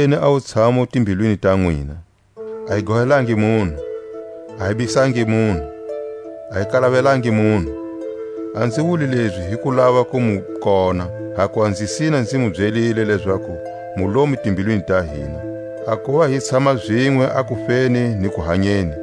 Hi longiseleni a wutshamu timbilwini ta nwina; a hi gohelangi munhu, a hi bihisangi munhu, a hi kalavelangi munhu. A nzi wuli lezi hi ku lava ku mu kona; hakuva nzi sina nzi mu byelile lezaku mu lomu timbilwini ta hina, a kuva hi tshama zinwe a kufeni ni kuhanyeni.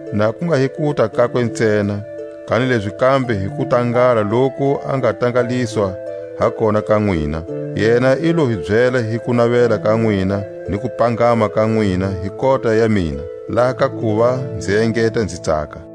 na ku nga hi kuta kakwe ntsena, kanilezi kambe hi kutangala loku a nga tangaliswa ha kona ka nwina. Yena i lo hi byela hi kunavela ka nwina ni kupangama ka nwina hi kota ya mina; laha ka kuva nzi engeta nzi tsaka.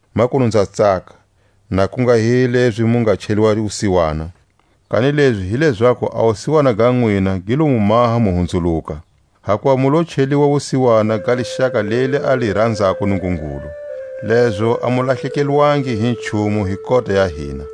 Makunu nza tsaka, na ku nga hi lezi mu nga cheliwa wusiwana, kanilezi hi lezaku a wusiwana ga nwina gi lo mu maha mu hunzuluka. Hakuva mu lo cheliwa wusiwana ga lixaka leli a li ranzako Nungungulu, lezo a mu lahlekelwangi hi nchumu hi kota ya hina.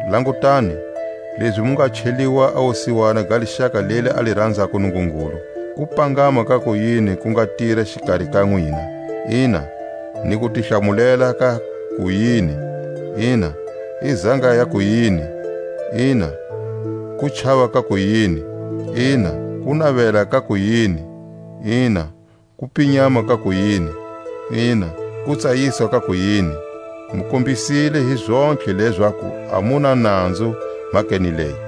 Langutani, lezi mu nga cheliwa a wusiwana ga lixaka leli a li ranzako Nungungulu; kupangama ka ku yini ku nga tira xikari ka nwina; ina, ni kutihlamulela ka ku yini; ina, i zanga ya ku yini; ina, kuchava ka ku yini; ina, kunavela ka ku yini; ina, kupinyama ka ku yini; ina, kutsayisa ka ku yini! Mu kombisile hi zontlhe lezaku a mu na nanzu mhakeni leyi.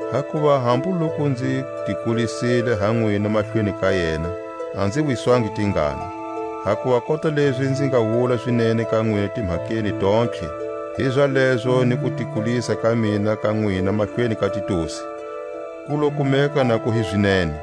Hakuva hambu loku nzi ti kulisile ha nwina mahlweni ka yena, a nzi wiswangi tingana; hakuva kota lezi nzi nga wula zinene ka nwina timhakeni tontlhe, hizalezo ni kutikulisa ka mina ha nwina mahlweni ka Titusi, ku lo kumeka na ku hi zinene.